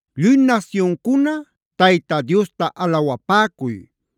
Lluy nasyuncuna Tayta Diosta alawapäcuy.